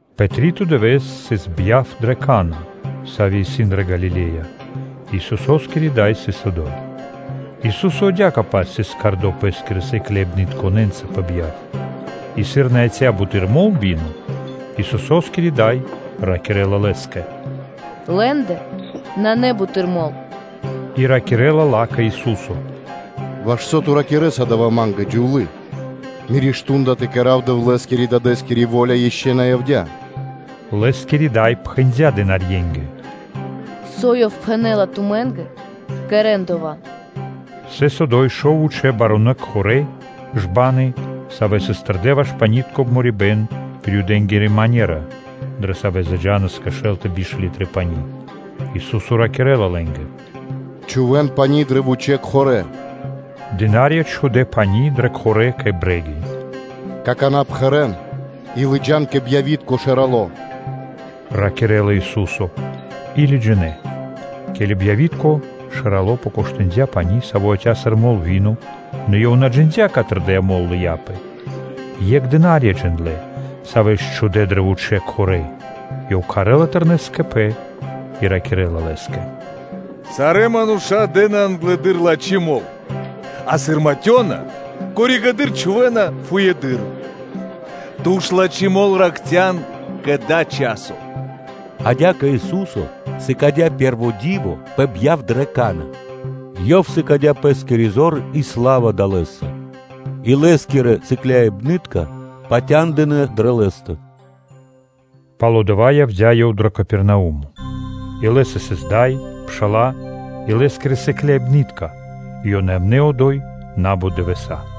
Пэ три́то дывэ́с сыс бьяв дрэ Кана́, сави́ сыс дрэ Галиле́я, и Исусо́скири Дай сыс одо́й. Ису́со адя́кэ-паць сыс кхардо Пэ́скирэ сыкляибнытконэ́нца пэ бьяв. И сыр на яця́ буты́р мол (вино), то Исусо́скири Дай ракирэ́ла Лэ́скэ: “Лэ́ндэ нанэ буты́р мол” И ракирэ́ла ла́кэ Ису́со: “Ваш со Ту ракирэ́са дава́ Ма́нгэ, Дро́го Джувлие? Миро мардо́ (шту́нда) тэ кэра́в Дэвлэ́скирэ-Дадэ́скири во́ля ишчо (инкэ́) на явдя́. Лэ́скири Дай пхэндя́ дынарье́нгэ: “Со Ёв пхэнэ́ла тумэ́нгэ, кэрэ́н дова́.” Сыс одо́й шов вучэ́ барунэ́ кхорэ́ (жбаны), савэ́ сыс тэрдэ́ ваш панитко обморибэн пир Юдэнгири манера, дрэ савэ́ заджанас кэ шэл тэ биш литры пани́. Ису́со ракирэ́ла лэ́нгэ: “Чхувэ́н пани́ дрэ вучэ́ кхорэ́.” Дына́рья чхудэ́ пани́ дрэ кхорэ́ кэ брэги. “Какана́ пхэрэн и лыджа́н кэ бьявитко пхурэды́р”, – ракирэ́ла Ису́со. И лыджинэ́. Ке́ли бьявитко пхурэды́р покоштындя пани́, саво́ яця́ сыр мол, /нэ ёв на джиндя́, каты́р дая́ мол лыяпэ, екх дына́рья (служытели) джиндлэ́, савэ́ ж чхудэ́ дрэ вучэ́ пирья пани́/, Ёв кхарэ́ла Тэрнэс кэ пэ, и ракирэ́ла лэ́скэ: “Сарэ́ мануша́ дэ́на англыдыр лачхи́ мол, а сыр матёна, коригэды́р (позжэды́р) чхувэ́на фуеды́р; ту ж лачхи́ мол ракхцян кэ дава́ часо.” Адя́кэ Ису́со сыкадя́ пэ́рво ди́во пэ бьяв дрэ Кана́. Ёв сыкадя́ Пэ́скири зор и сла́ва далэ́са, и Лэ́скирэ сыкляибны́тка (учэники) патяндынэ́ дрэ Лэ́стэ. Пало́ дава́ явдя́ Ёв дро Капернаумо, и Лэ́са сыс Дай, пша́ла и Лэ́скирэ сыкляибны́тка и ёнэ явнэ́ одо́й на́бут дывэса́.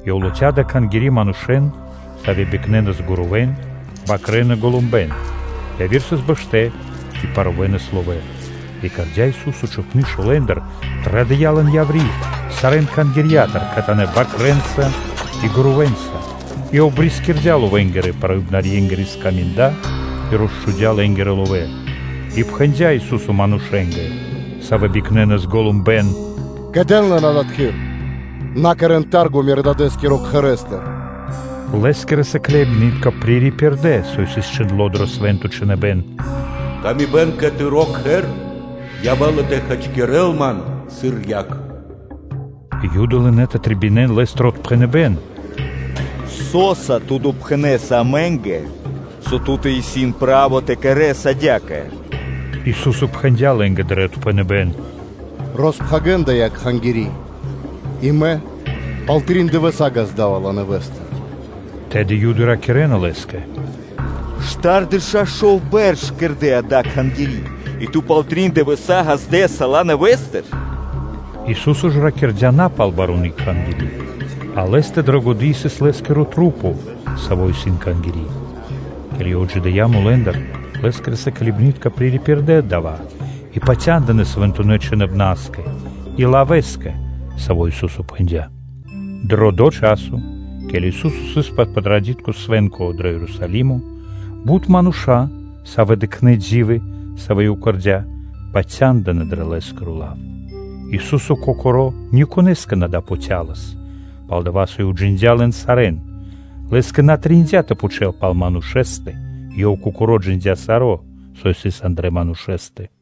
Ёв латхя́ дрэ Кхангири́ манушэ́н, савэ́ бикнэнас гурувэ́н, бакрэ́н и голумбэн; яви́р сыс бэштэ́ и парувэнас ловэ́; и кэрдя́ Ису́со чхупны шолэндыр, традыя́ лэн яври́ сарэ́н Кхангирья́тыр кхэтанэ́ бакрэнца и гурувэнца и обрискирдя ловэнгирэ-паруибнарьенгирэ скаминда и росчхудя́ лэ́нгирэ ловэ́. И пхэндя́ Ису́со манушэ́нгэ, савэ́ бикнэнас голумбэн: “Закэдэн лэн адатхы́р! На кэрэ́н тарго Мирэ́-Дадэ́скирэ Кхэрэ́стыр.” Лэ́скирэ сыкляибны́тка пририпирдэ, со сыс чхиндло́ дрэ Свэ́нто Чхиныбэ́н: “Зэвлыныпэ́н (Ревность) кэ Тыро́ Кхэр явэ́ла тэ хачкирэл Ман сыр яг.” Юды лынэ́ тэ трэбинэн Лэ́стыр отпхэныбэ́н: “Со́са Ту допхэнэса амэ́нгэ, со ту́тэ исын право тэ кэрэ́с адя́кэ?” Ису́со пхэндя́ лэ́нгэ дрэ отпхэныбэ́н: “Роспхагирэн дая́ Кхангири́, и Мэ пал трин дывэса́ ґазда́ва ла нэвэ́стыр.” Тэды Юды ракирэ́на Лэ́скэ: “Штардэша́ шов бэрш кэрдэ́ дая́ Кхангири́ и Ту пал трин дывэса́ ґаздэса ла нэвэ́стыр?” Ису́со ж ракирдя́ на пал баруны Кхангири́, а Лэ́стэ пэ годы́ сыс Лэ́скирэ маса́, Савэ исын Кхангири́. Ке́ли Ёв отджидыя́ мулэ́ндыр, Лэ́скирэ сыкляибны́тка пририпирдэ дава́, и патяндынэ́ Свэнтонэ́ Чхиныбнаскэ и лавэ́скэ, саво́ Ису́со пхэндя́. Дро дова́ часо, ке́ли Ису́со сыс пэ Патрадитко свэ́нко дро Ерусалимо, бут мануша́, савэ́ дыкхнэ́ ди́вы, савэ́ Ёв кэрдя́, патяндынэ́ дрэ Лэ́скиро лав. Ису́со Кокоро́ никонэ́скэ лэ́ндыр на допатялас Пэс, пал-дова́ со Ёв джиндя́ лэн сарэ́н. Лэ́скэ на трэиндя́ тэ пхучэл пал манушэ́стэ, Ёв Кокоро́ джиндя́ саро́, со сыс андра́л манушэ́стэ.